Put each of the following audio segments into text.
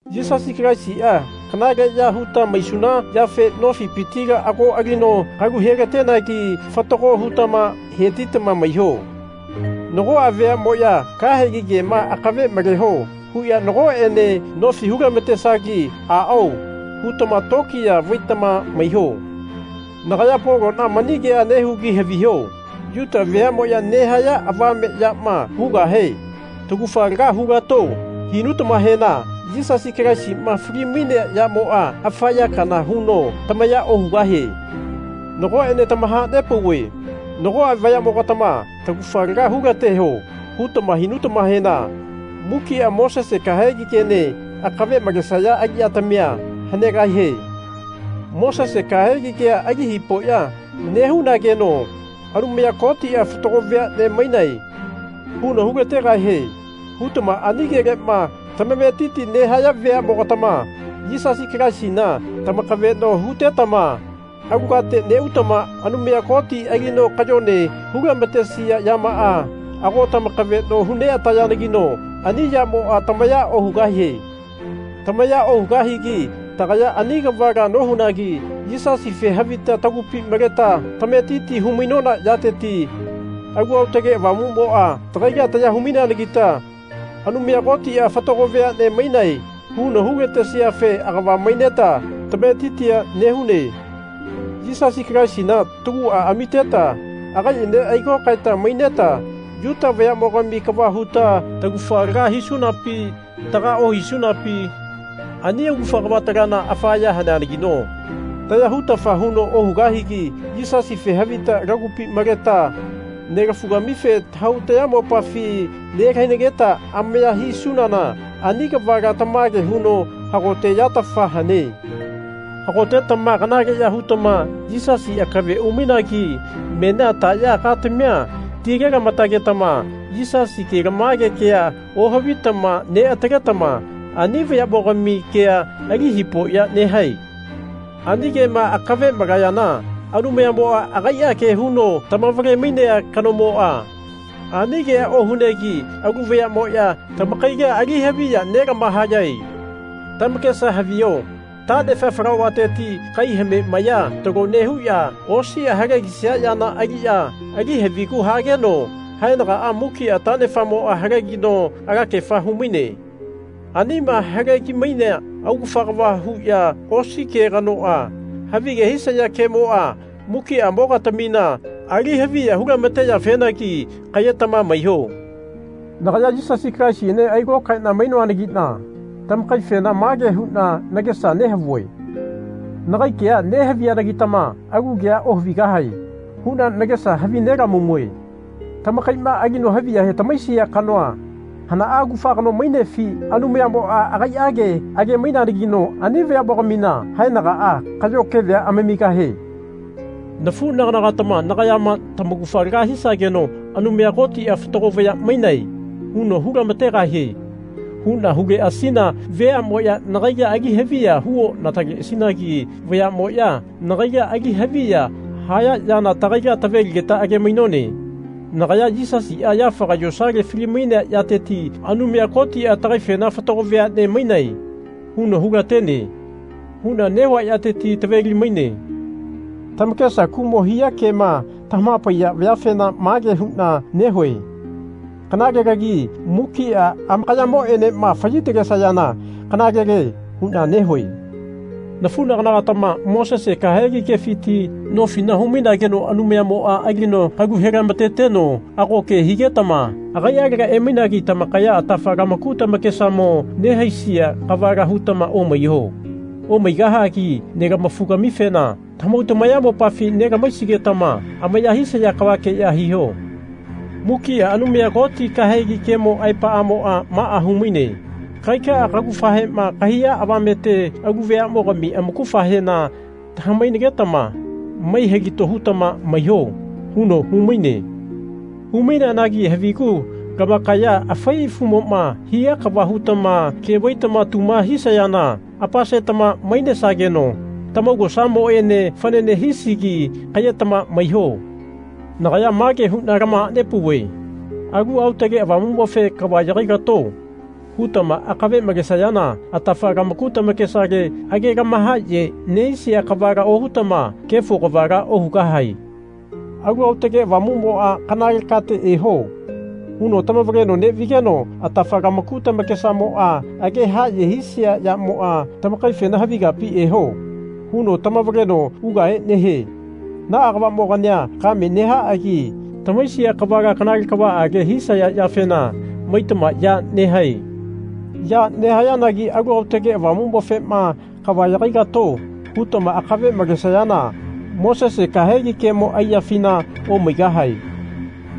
Yisasi Kalaisia kanaleya huta maisuna yafe nofipitila ago alino kalu helatenegi fatago hutama hetitama maiho. Nagoa veanemoya Kahegi kema akave maleho. huya nagoene nofi hu-lamatesagi Aao. hutama tokiya vaitama maiho. Nagaya Polona mani kea nehugi haviho. Yuta veamoya nehaya avame yama hugahe Taugafa laga hulato. hinutamahena Yisasi Kalaisima fali-mainea yamoa afa ya kana huno tamaya ohugahie. Nagoene tamahanepauve nagoa vayamogatama Taugafa laga hulateho. hutama hinutamahena mukia Mosese kahegi kene akave malesaya aliyatamia hanegahie. Mosese kahegi kea ali hipoya nehunageno Anumaya Kotia Fatago veane mainae. huno hulategahie. hutama ani kelema tamametiti nehaya veamogatama Yisasi Kalaisina tamakaveno hutetama alu kate neutama Anumaya Koti alino kayone hu-lamatesia yamaa ago tamakaveno hu neatayanagino ani yamoa tamaya ohugahie. Tamaya ohugahigi tagaya ani kavala nohunagi Yisasife havita tagupi maleta tametiti hu-mainona yateti Alu Aotake Avamumoa tagaila taya hu-maineanagita Anumaya Kotia Fatago veane mainae. huno hu-latesiafe agava maineta tametitia nehune. Yisasi Kalaisina tagua amiteta agaiene ailokaeta maineta Yuta vayamogami kava huta taugafa laga hisunapi taga ohisunapi ani augafa kavatalana afa ya haneanagino taya hutafa huno ohugahigi Yisasife havita lagupi maleta nelafugamife tahau tayamopafi nelahainageta amaya hisunana ani kavala tamage huno hagote yatafa hane. Hagotetama kanaleya hutama Yisasi akave umainagi menia taya katamia tile-lamatagetama Yisasi kelamage kea ohavitama neataletama ani vayamogami kea ali hipoya nehae? Ani kema akave malayana Anumayamoa agaia ke huno tamavale-mainea kanomoa ani kea ohunegi alu vayamoya tamakaila alihaviya nelamahayae. Tamakesa haviho tanefa falauvateti kai hame maya talo nehuya osia halegisia yana aliya ali havigu hagenoa haenagaa mukia tanefamoa halegino alakefa humaine. Anima halegi-mainea augafa kava huya osi ke kanoa, havige hisaya kemoa mukiamogatamina ali haviya hu-lamateyafenagi kayetama maiho. Nagaya Yisasi Kalaisiene ailokaena mainoanagina tamakaifena mage huna nagesa nehavue Nagai kea nehaviyanagitama alu kea ohavigahae. huna nagesa havine-lamamue. Tamakaima alino haviya tamahaisia kanoa hana augafa kano mainefi? Anumayamoa agaiage age-maineanagino ani vayamogamina haenagaa kayo kevea amamigahie. Nafunaganagatama nagayama Tamaugafa laga hisageno Anumaya Kotia Fatago vaya mainae. huno hu-lamategahie. huna huleasina veamoya nagaila ali haviya hu onataleasinagi vayamoya nagaila ali haviya haya yana tagaila taveligeta age-mainone. Nagaya Yisasia yafaga yosale fali-mainea yateti Anumaya Kotia tagaifena Fatago veane mainae. huno hulatene. huna nehua yateti taveli-maine. Tamakesa kumo hia kema tamahapaiya vayafena mage huna nehue Kanalelagi mukia amakayamoenema fayi-talesayana kanalele. huna nehue. Nafunagana-gatama Mosese kahegi kefiti nofila humainageno Anumayamoa alino kalu he-lamateteno ago ke higetama agaialega emainagi tamakaya atafa lamaku tamakesamo nehaisia kavala hutama omaiho. Omaigahagi nelamafu-gamifena tamahau tamayamopafi nelama-haisigetama amaya hisaya kavakeya hiho. Mukia Anumaya Koti kahegi kemo aepamoa maa humaine. Kagaika kaugafahema kahaiya avamete alu veamogami amaugafahena tama-hainagetama mai-hilato hutama maiho. huno humaine. Hu-maineanagi havigu lamakaya afai afumoma hia kava hutama ke vaitama tuma hisayana apasetama mainesageno tamaugosamoene fanane hisigi kayetama maiho. Nagaya mage huna tamahanepauve Alu Aotage Avamumofe Kava yagai-lato. hutama akave malesayana atafa lamaku tamakesale age lamahaye nehisia kavala ohutama kefo kavala ohugahae. Alu Aotage Avamumoa Kanale kate eho. huno tamavaleno nevigeno atafa lamaku tamakesamoa age haye hisia yamoa tamakaifena Havi kapi eho. huno tamavaleno ugahe nehie. Naa kavamogania kame nehaagi tamahaisia kavala kanale kavaage hisaya yafena maitama ya nehae. Ya nehayanagi Alu Aotage Avamumofema Kava yagai-lato. hutama akave malesayana Mosese kahegi kemo aiyafina omaigahae.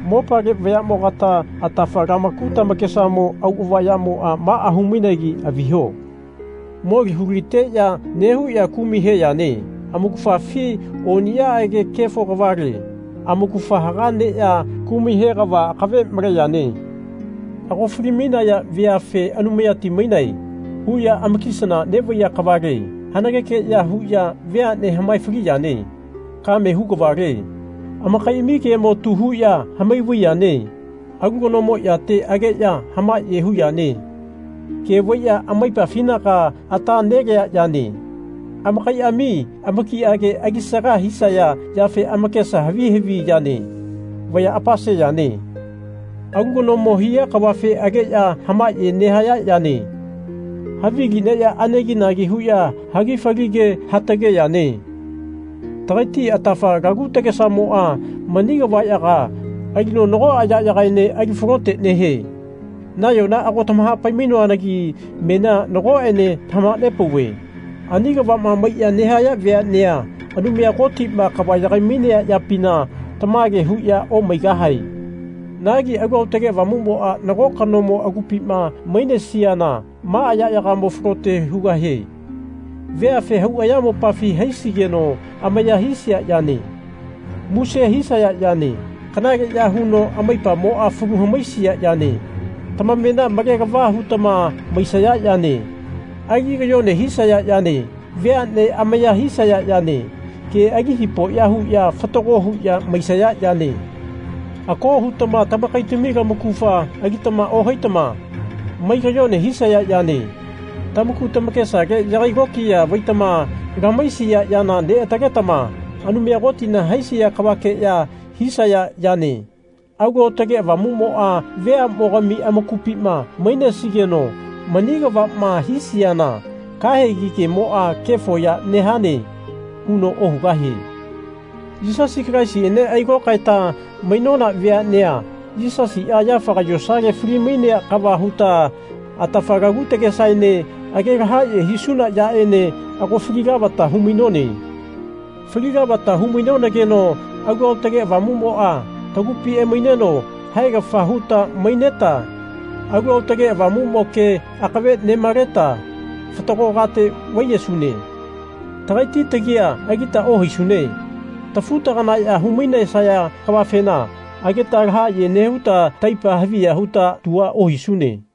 Mopale vayamogata atafa lamaku tamakesamo auava yamoa maa humainegi haviho. Moli huliteya nehuya kumai he yane. Amaugafafi oniyaage kefo kavale. Amaugafa haga neya kumai he kava akave male yane. Ago fali-mainaya veafe Anumayati mainae. huya amakisana nevaiya kavale. Hanageke ya huya veane hamae-fali yane. Kame hu kavale. Amakaiami kemo tu huya hamai vai yane. Alu kanomo yate ageya hamaye hu yane. Ke vaiya amaipafinaga ata nelea yane. Amakaiami amakiake alisaga hisaya yafe amakesa havi havi yane. Vaya apase yane. Alu kanomo hia kavafe ageya hamaye nehaya yane. Havili neya aneginagi huya hagi fali ke hatage yane. Tagaiti atafa lagu tagesamoa mani kavayaga alino nagoa yayagaene alifalote nehie. Nayona ago tamahapai-mainoanagi menia nagoene tamahanepauve ani kavama maiya nehaya veanea Anumaya Kotima kava yagai-mainea yapina tamage huya omaigahae. Nagi Alu Aotage Avamumoa nago kanomo agupima mainesiana maa yayagamo falote hugahie. Veafe hau ayamopafi haisigeno amaya hisia yane. Muse hisaya yane. Kanaleya huno amaipamoa falu hamaisia yane. Tamamena male-lava hutama maisaya yane. Ali kayone hisaya yane. Veane amaya hisaya yane. Ke ali hipoya huya fatago huya maisaya yane. Ako hutama tamakaitami lamaugafa alitama ohaitama mai kayone hisaya yane. Tamaku tamakesale yagai lokiya vaitama lamahaisia yana neataletama Anumaya Kotina haisia kavakeya hisaya yane. Alu Aotage Avamumoa veamogami amakupima mainesigeno mani kavama hisiana kahegi kemoa Kefo ya nehane. huno ohugahie. Yisasi Kalaisiene ailokaeta mainona veanea Yisasia yafaga yosale fali-mainea kava huta atafa laku takesaene age lahaye hisuna yaene ago fali lavata humainone. Fali lavata hu-mainonageno Alu Aotage Avamumoa tagupi emaineno haegafa huta maineta Alu Aotage Avamumo ke akave nemaleta fatago kate vaiyesune. Tagaiti tagia alita ohaisune. Tafu-taganaya humainesaya kavafena ageta lahaye nehuta taipa haviya huta tua ohisune.